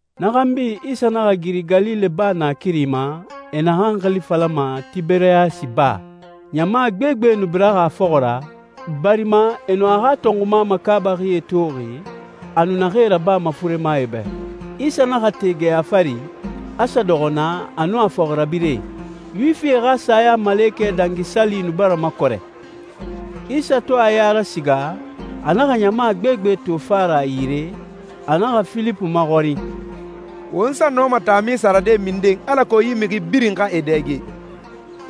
Na xanbi, Isa naxa giri Galile Baa naakiri ma, e naxan xili falama Tiberiyasi Baa. Ɲama gbegbe nu biraxi a fɔxɔ ra, barima e nu a xa tɔnxuma makaabaxie toxi, a nu naxee rabama furemae bɛ. Isa naxa te geya fari, a sa dɔxɔ naa a nun a fɔxirabirɛe. Yuwifie xa Sayamalekɛ Dangi Sali nu bara makɔrɛ. Isa to a ya rasiga, a naxa ɲama gbegbe to fa ra a yire, a naxa Filipu maxɔrin, «Won sa nɔma taami sarade minden alako yi mixi birin xa e dɛge?»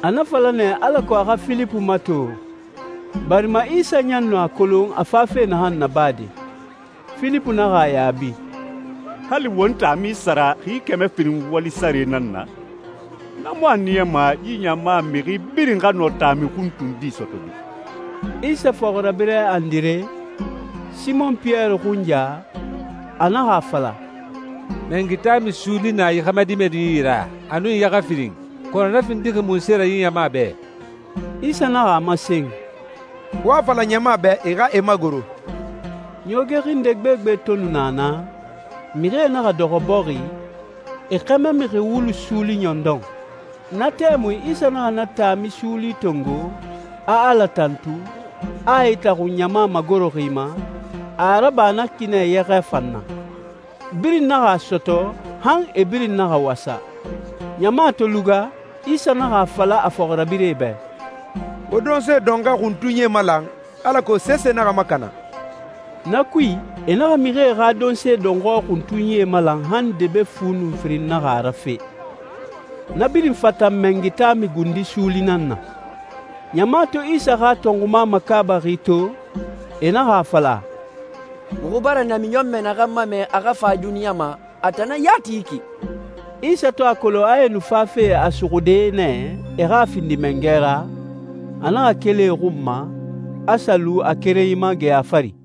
A na fala nɛ alako a xa Filipu mato, barima Isa ɲan nu a kolon a fafe naxan nabade. Filipu naxa a yaabi, «Hali won taami sara xi kɛmɛ firin wali sare nan na, na mu a niyama yi ɲama mixi birin xa nɔ taami xuntundi sɔtɔde.» Isa fɔxirabirɛ Andire, Simɔn Piyɛri xunya, a naxa a fala, «Mɛngi taami suuli na yi xɛmɛ dimɛdi yi ra, a nun yɛxɛ firin, kɔnɔ na findixi munse ra yi ɲama bɛ?» Isa naxa a masen, «Wo a fala ɲama bɛ e xa e magoro.» Ɲooge xinde gbegbe to nu na naa, mixie naxa dɔxɔ bɔxi, e xɛmɛ mixi wulu suuli ɲɔndɔn. Na tɛmui, Isa naxa na taami suuli tongo, a Ala tantu, a e itaxun ɲama magoroxi ma, a a raba na ki nɛ yɛxɛ fan na. Birin naxa a sɔtɔ, han e birin naxa wasa. Ɲama to luga, Isa naxa a fala a fɔxirabirɛe bɛ, «Wo donse dɔnxɔɛ xuntunyie malan, alako sese naxa makana.» Na kui, e naxa mixie xa donse dɔnxɔɛ xuntunyie malan han debe fu nun firin naxa rafe. Na birin fatan mɛngi taami gundi suuli nan na. Ɲama to Isa xa tɔnxuma makaabaxi to, e naxa a fala, «Muxu bara namiɲɔnmɛ naxan mamɛ a xa fa duniɲa ma, a tan nan yati yi ki!» Isa to a kolon a e nu fafe a suxude nɛ e xa a findi mangɛ ra, a naxa keli e xun ma, a sa lu a kerenyi ma geya fari.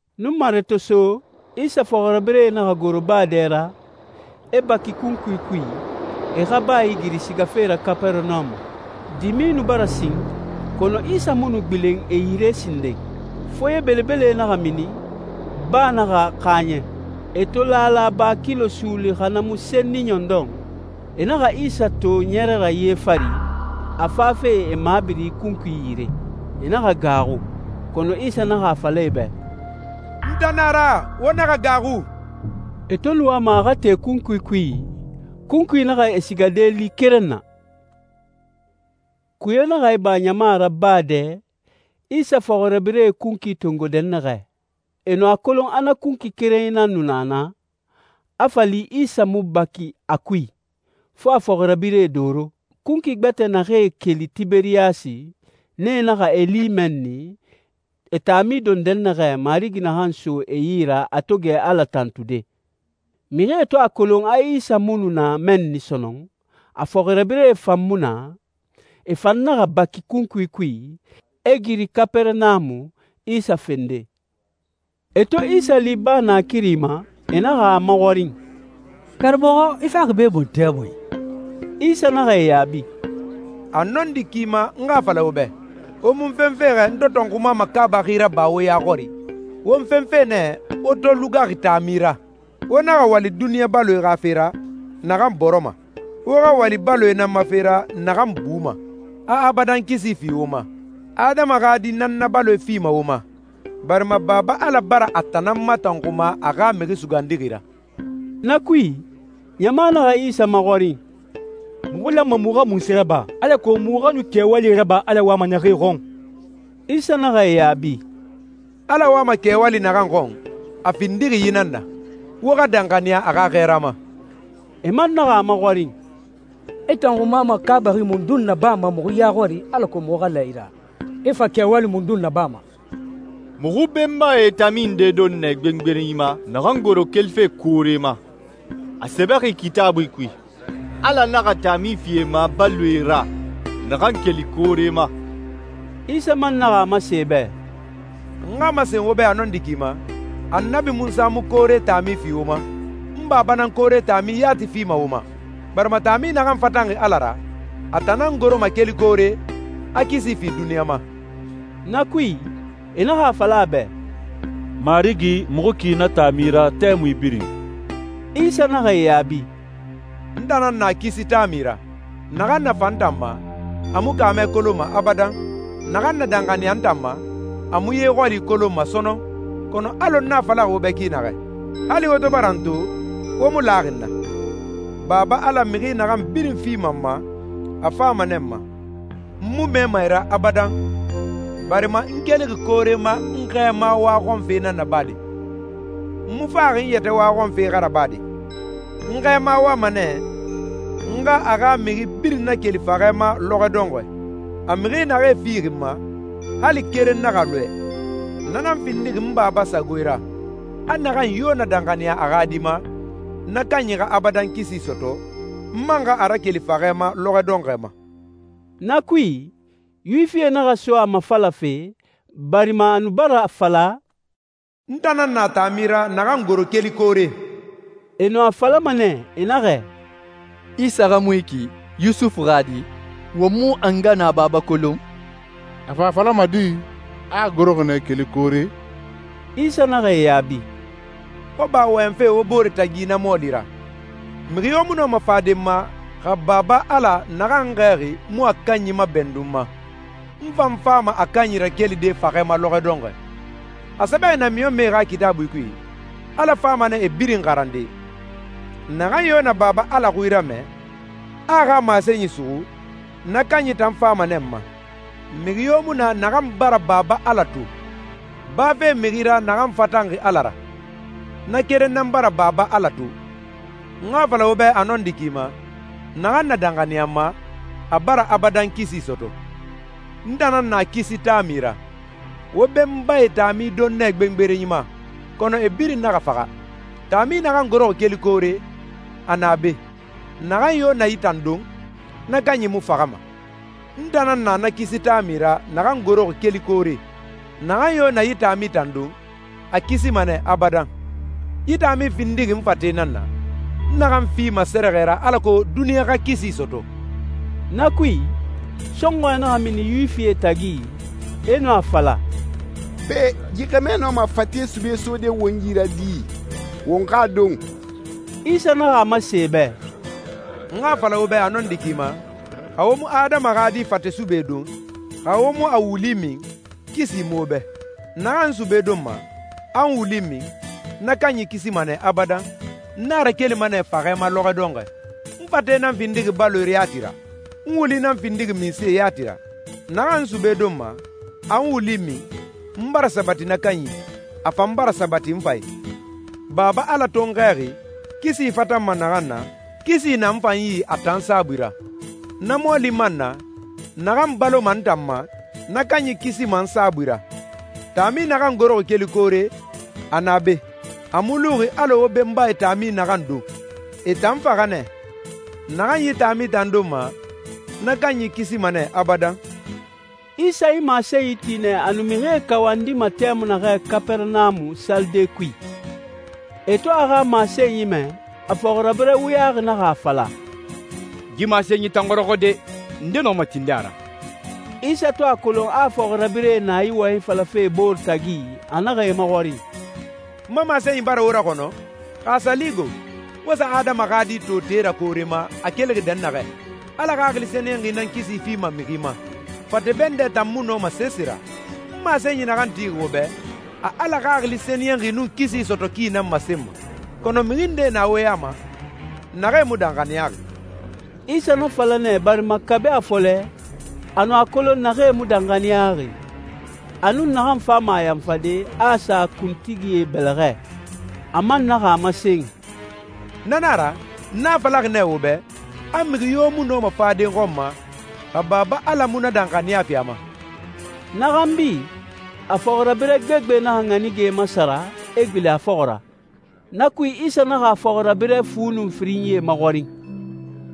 Nunmare to so, Isa fɔxirabirɛe naxa goro baa dɛ ra, e baki kunkui kui, e xa baa igiri sigafe ra Kapɛrɛnamu. Dimi nu bara sin, kɔnɔ Isa mu nu gbilen e yire sinden. Foye belebele naxa mini, baa naxa xaaɲɛ. E to laala ba kilo suuli xa na mu senni ɲɔndɔn, e naxa Isa to ɲɛrɛ ra ye fari, a fafe e mabiri kunkui yire. E naxa gaaxu. Kɔnɔ Isa naxa a fala e bɛ, «N tan nan a ra. Wo naxa gaaxu.» E to nu wama a xa te kunkui kui, kunkui naxa e sigade li keren na. Kuye naxa iba ɲama ra baa dɛ, Isa fɔxirabirɛe kunkui tongo dɛnnaxɛ. E nu a kolon a na kunkui kerenyi nan nu na naa, a fa li Isa mu baki a kui, fo a fɔxirabirɛe doro. Kunkui gbɛtɛ naxee keli Tiberiyasi, nee naxa e li mɛnni, e taami don dɛnnaxɛ, Marigi naxan so e yi a to gɛ Ala tantude. Mixie to a kolon a Isa mu nu na mɛnni sɔnɔn, a fɔxirabirɛe fan mu na, e fan naxa baki kunkuie kui, e giri Kapɛrɛnamu, Isa fende. E to Isa li baa naakiri ma, e naxa a maxɔrin, «Karamɔxɔ, i faxi be mun tɛmui?» Isa naxa e yaabi, «A nɔndi ki ma n xa a fala wo bɛ, wo mu n fenfe xɛ n to tɔnxuma makaabaxi raba wo ya xɔri. Wo n fenfe nɛ wo to lugaxi taami ra. Wo naxa wali duniɲa baloe xa fe ra, naxan bɔrɔma. Wo xa wali baloe nan ma fe ra naxan buma, a abadan kisi fi wo ma. Adama xa Di nan na baloe fima wo ma, barima Baba Ala bara a tan nan matɔnxuma a xa Mixi Sugandixi ra.» Na kui, ɲama naxa Isa maxɔrin, «Muxu lanma muxu xa munse raba alako muxu xa nu kɛwalie raba Ala wama naxee xɔn?» Isa naxa e yaabi, «Ala wama kɛwali naxan xɔn, a findixi yi nan na: Wo xa danxaniya a xa xɛɛra ma.» E man naxa a maxɔrin, «I tɔnxuma makaabaxi mundun nabama muxu ya xɔri alako muxu xa la i ra? I fa kɛwali mundun nabama? Muxu benbae taami nde don nɛ gbengberenyi ma naxan goro kelife koore ma. A sɛbɛxi Kitaabui kui, ‹Ala naxa taami fi e ma baloe ra, naxan keli koore ma.›» Isa man naxa a masen e bɛ, «N xa a masen wo bɛ a nɔndi ki ma, Annabi Munsa mu koore taami fi wo ma. N Baba nan koore taami yati fima wo ma. Barima taami naxan fatanxi Ala ra, a tan nan goroma keli koore, a kisi fi duniɲa ma.» Na kui, e naxa a fala a bɛ, «Marigi, muxu ki na taami ra tɛmui birin.» Isa naxa e yaabi, «N tan nan na kisi taami ra. Naxan na fa n tan ma, a mu kaamɛ kolonma abadan. Naxan na danxaniya n tan ma, a mu ye xɔli kolonma sɔnɔn. Kɔnɔ alɔ n a falaxi wo bɛ ki naxɛ, hali wo to bara n to, wo mu laxi n na. Baba Ala mixi naxan birin fima n ma, a fama nɛ n ma, n mu mɛɛma e ra abadan, barima n kelixi koore ma n Xɛɛma waxɔnfe nan nabade. N mu faxi n yɛtɛ waxɔnfe xa rabade. N Xɛɛma wama nɛ n xa a xa mixi birin nakeli faxɛ ma lɔxɔ dɔnxɔɛ. A mixi naxee fixi n ma, hali keren naxa lɔɛ. Na nan findixi n Baba sagoe ra, a naxan yo na danxaniya a xa Di ma, na kanyi xa abadan kisi sɔtɔ, n man xa a rakeli faxɛ ma lɔxɔ dɔnxɔɛ ma.» Na kui, Yuwifie naxa so a mafalafe, barima a nu bara a fala, «N tan nan na taami ra naxan goro keli koore.» E nu a falama nɛ, e naxɛ, «Isa xa mu yi ki, Yusufu xa di? Won mu a nga nun a baba kolon? A fa a falama di, a a goroxi nɛ keli koore?» Isa naxa e yaabi, «Wo ba wɔyɛnfe wo bore tagi na mɔɔli ra. Mixi yo mu nɔma fade n ma, xa Baba Ala, naxan n xɛɛxi, mu a kanyi mabɛndun n ma. N fan fama a kanyi rakelide faxɛ ma lɔxɔ dɔnxɔɛ. A sɛbɛxi namiɲɔnmɛe xa Kitaabui kui, ‹Ala fama nɛ e birin xarande.› Naxan yo na Baba Ala xui ramɛ, a a xa masenyi suxu, na kanyi tan fama nɛ n ma. Mixi yo mu na naxan bara Baba Ala to, bafe mixi ra naxan fatanxi Ala ra. Na keren nan bara Baba Ala to.» «N xa a fala wo bɛ a nɔndi ki ma, naxan na danxaniya n ma, a bara abadan kisi sɔtɔ. N tan nan na kisi taami ra. Wo benbae taami don nɛ gbengberenyi ma, kɔnɔ e birin naxa faxa. Taami naxan goroxi keli koore, a na be. Naxan yo na yi tan don, na kanyi mu faxama. N tan nan na na kisi taami ra naxan goroxi keli koore. Naxan yo na yi taami tan don, a kisima nɛ abadan. Yi taami findixi n fate nan na, n naxan fima sɛrɛxɛ ra alako duniɲa xa kisi sɔtɔ.» Na kui, sɔnxɔɛ naxa mini Yuwifie tagi, e nu a fala, «Pe, yi xɛmɛ nɔma a fate sube sode won yi ra di, won xa a don?» Isa naxa a masen e bɛ, «N xa a fala wo bɛ a nɔndi ki ma, xa wo mu Adama xa Di fate sube don, xa wo mu a wuli min, kisi mu wo bɛ. Naxan n sube donma, a n wuli min, na kanyi kisima nɛ abadan, n a rakelima nɛ faxɛ ma lɔxɔ dɔnxɔɛ. N fate nan findixi baloe yati ra. N wuli nan findixi minse yati ra. Naxan n sube donma, a n wuli min, n bara sabati na kanyi i, a fan bara sabati n fan i. Baba Ala to n xɛɛxi, kisi fatanma naxan na, kisi na n fan yi a tan saabui ra. Na mɔɔli man na, naxan baloma n tan ma, na kanyi kisima n saabui ra. Taami naxan goroxi keli koore, a na be. A mu luxi alɔ wo benbae taami naxan don. E tan faxa nɛ. Naxan yi taami tan donma, na kanyi kisima nɛ abadan.» Isa yi masenyi ti nɛ a nu mixie kawandima tɛmui naxɛ Kapɛrɛnamu salide kui. E to a xa masenyi mɛ, a fɔxirabirɛ wuyaxi naxa a fala, «Yi masenyi tan xɔrɔxɔ de! Nde nɔma tinde a ra?» Isa to a kolon a a fɔxirabirɛe na yi wɔyɛnyi falafe e bore tagi, a naxa e maxɔrin, «N ma masenyi bara wo raxɔnɔ? Xa a sa li go, wo sa Adama xa Di to te ra koore ma, a kelixi dɛnnaxɛ? Ala Xaxili Sɛniyɛnxi nan kisi fima mixi ma. Fate bɛndɛ tan mu nɔma sese ra. N masenyi naxan tixi wo bɛ, a Ala Xaxili Sɛniyɛnxi nun kisi sɔtɔ ki nan masenma. Kɔnɔ mixi ndee na wo ya ma, naxee mu danxaniyaxi.» Isa na fala nɛ barima kabi a fɔlɛ, a nu a kolon naxee mu danxaniyaxi, a nun naxan fama a yanfade, a a sa kuntigie bɛlɛxɛ. A man naxa a masen, «Na nan a ra, n a falaxi nɛ wo bɛ, a mixi yo mu nɔma fade n xɔn ma, xa Baba Ala mu na danxaniya fi a ma.» Na xanbi, a fɔxirabirɛ gbegbe naxa ɲanige masara, e gbilen a fɔxɔ ra. Na kui, Isa naxa a fɔxirabirɛ fu nun firinyie maxɔrin,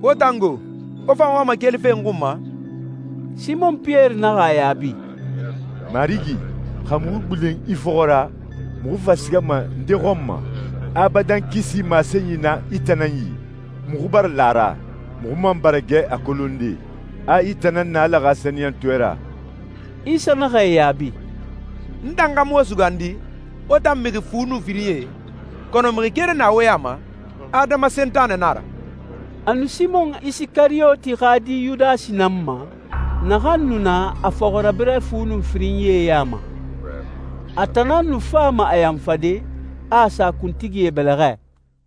«Wo tan go? Wo fan wama kelife n xun ma?» Simɔn Piyɛri naxa a yaabi, «Marigi, xa muxu gbilen i fɔxɔ ra, muxu fa sigama nde xɔn ma? Abadan kisi masenyi na i tan nan yi. Muxu bara la a ra, muxu man bara gɛ a kolonde, a i tan nan na Ala xa Sɛniyɛntɔɛ ra.» Isa naxa e yaabi, «N tan xa mu wo sugandi, wo tan mixi fu nun firinyie? Kɔnɔ mixi keren na wo ya ma, adama sentanɛ nan a ra.» A nu Simɔn Isikariyoti xa di Yudasi nan ma, naxan nu na a fɔxirabirɛ fu nun firinyie ya ma. A tan nan nu fama a yanfade, a a sa kuntigie bɛlɛxɛ.